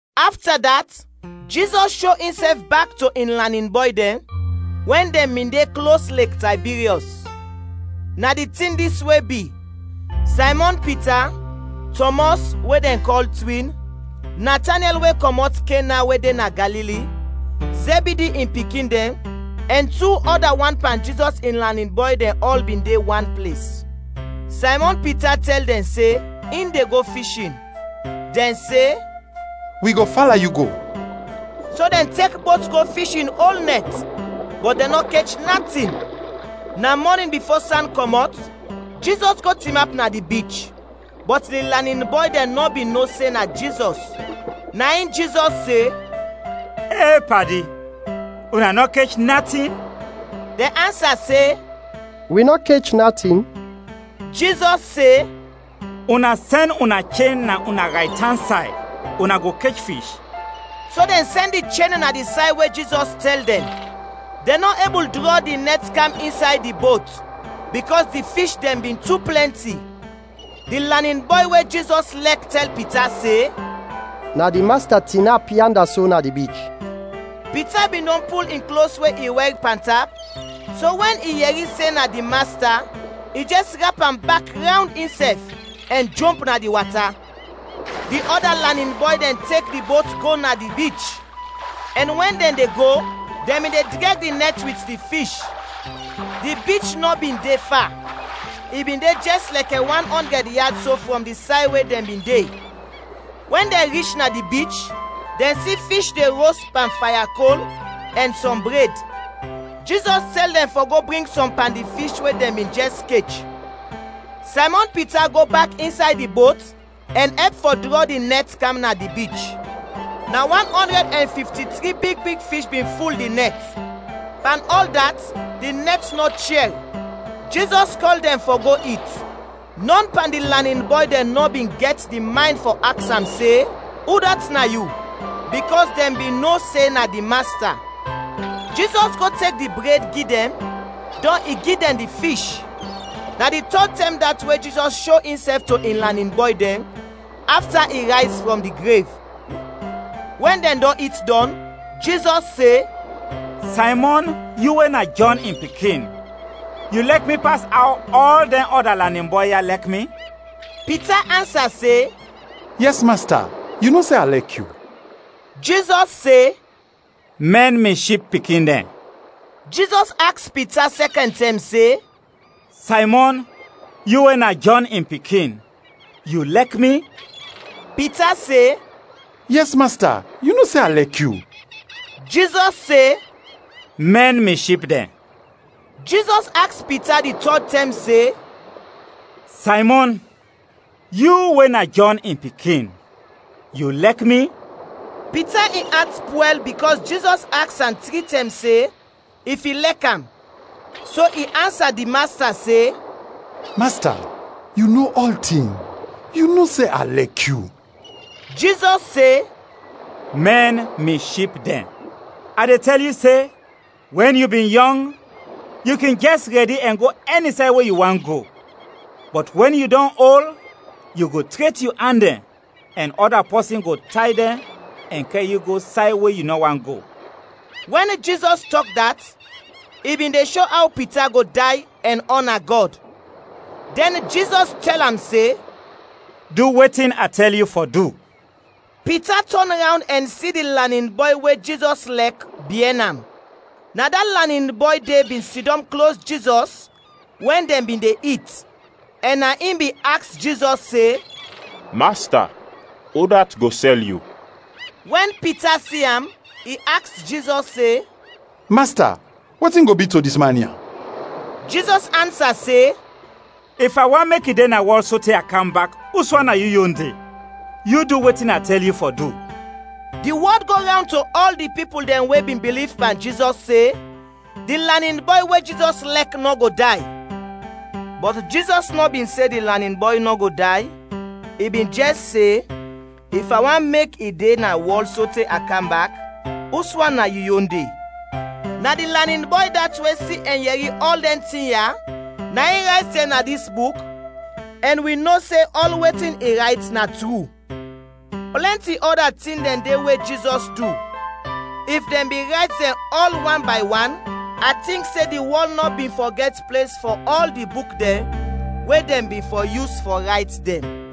Afta dat, Jizɔs sho insɛf bak to in lanin bɔy dɛn, wɛn dɛn bin de klos Lek Taybiryɔs. Na di tin dis we bi: Saymɔn Pita; Tɔmɔs, we dɛn kɔl “Twin”; Natanyɛl we kɔmɔt Kena we de na Galili; Zɛbidi in pikin dɛn; ɛn tu ɔda wan pan Jizɔs in lanin bɔy dɛn ɔl bin de wan ples. Saymɔn Pita tɛl dɛn se, in de go fishin. Dɛn se, “Wi go fala yu go.” So dɛn tek bot go fishin ol nɛt, bɔt dɛn nɔ kech natin. Na mɔnin bifo san kɔmɔt, Jizɔs go tinap na di bich, bɔt di lanin bɔy dɛn nɔ bin no se na Jizɔs. Na in Jizɔs se, “E padi! Una nɔ kech natin?” Dɛn ansa se, “Wi nɔ kech natin.” Jizɔs se, “Una sɛn una chen na una raytan say, una go kech fish.” So dɛn sɛn di chen na di say we Jizɔs tɛl dɛn; dɛn nɔ ebul drɔ di nɛt kam insay di bot, bikɔs di fish dɛn bin tu plɛnti. Di lanin bɔy we Jizɔs lɛk tɛl Pita se, “Na di Masta tinap yanda so na di bich!” Pita bin dɔn pul in klos we i wɛr pantap, so wɛn i yɛri se na di Masta, i jɛs rap am bak rawnd insɛf, ɛn jomp na di wata. Di ɔda lanin bɔy dɛn tek di bot go na di bich, ɛn wɛn dɛn de go, dɛn bin de drɛg di nɛt wit di fish. Di bich nɔ bin de fa, i bin jɛs de lɛkɛ wan ɔndrɛd yad so frɔm di say we dɛn bin de. Wɛn dɛn rich na di bich, dɛn si fish de ros pan faya kol, ɛn sɔm bred. Jizɔs tɛl dɛn fɔ go bring sɔm pan di fish we dɛn bin jɛs kech. Saymɔn Pita go bak insay di bot ɛn ɛp fɔ drɔ di nɛt kam na di bich. Na wan ɔndrɛd ɛn fifti-tri big big fish bin ful di nɛt. Pan ɔl dat, di nɛt nɔ chɛr. Jizɔs kɔl dɛn fɔ go it. Nɔn pan di lanin bɔy dɛn nɔ bin gɛt di maynd fɔ aks am se, “Udat na yu?” bikɔs dɛn bin no se na di Masta. Jizɔs go tek di bred gi dɛn, dɔn i gi dɛn di fish. Na di tɔd tɛm dat we Jizɔs sho insɛf to in lanin bɔy dɛn, afta i rayz frɔm di grev. Wɛn dɛn dɔn it dɔn, Jizɔs se, “Saymɔn, yu we na Jɔn in pikin, yu lɛk mi pas aw ɔl dɛn ɔda lanin bɔy ya lɛk mi?” Pita ansa se, “Yɛs, Masta, yu no se a lɛk yu.” Jizɔs se, “Mɛn mi ship pikin dɛn.” Jizɔs aks Pita sɛkɛn tɛm se, “Saymɔn, yu we na Jɔn in pikin, yu lɛk mi?” Pita se, “Yɛs, Masta, yu no se a lɛk yu.” Jizɔs se, “Mɛn mi ship dɛn.” Jizɔs aks Pita di tɔd tɛm se, “Saymɔn, yu we na Jɔn in pikin, yu lɛk mi?” Pita in at pwɛl bikɔs Jizɔs aks am tri tɛm se if i lɛk am, so i ansa di Masta se, “Masta, yu no ɔltin, yu no se a lɛk yu!” Jizɔs se, “Mɛn mi ship dɛn. A de tɛl yu se, wɛn yu bin yɔng, yu kin jɛs rɛdi ɛn go ɛni say we yu want go, bɔt wɛn yu dɔn ol, yu go tret yu an dɛn, ɛn ɔda pɔsin go tay dɛn ɛn kɛr yu go say we yu nɔ want go.” (Wɛn Jizɔs tɔk dat, i bin de sho aw Pita go day, ɛn ɔna Gɔd.) Dɛn Jizɔs tɛl am se, “Du wetin a tɛl yu fɔ du.” Pita tɔn rawnd ɛn si di lanin bɔy we Jizɔs lɛk biɛn am. Na da lanin bɔy de bin sidɔm klos Jizɔs wɛn dɛn bin de it, ɛn na in bin aks Jizɔs se, “Masta, udat go sɛl yu?” Wɛn Pita si am, i aks Jizɔs se, “Masta, wetin go bi to dis man ya?” Jizɔs ansa se, “If a want mek i de na wɔl sote a kam bak, uswan na yu yon de? Yu du wetin a tɛl yu fɔ du.” Di wɔd go rawnd to ɔl di pipul dɛn we bin biliv pan Jizɔs se, di lanin bɔy we Jizɔs lɛk nɔ go day. Bɔt Jizɔs nɔ bin se di lanin bɔy nɔ go day, i bin jɛs se, “If a want mek i de na wɔl sote a kam bak, uswan na yu yon de?” Na di lanin bɔy dat we si ɛn yɛri ɔl dɛn tin ya, na in rayt dɛn na dis buk, ɛn wi no se ɔl wetin i rayt na tru. Plɛnti ɔda tin dɛn de we Jizɔs du. If dɛn bin rayt dɛn ɔl wan bay wan, a tink se di wɔl nɔ bin fɔ gɛt ples fɔ ɔl di buk dɛn we dɛn bin fɔ yus fɔ rayt dɛn.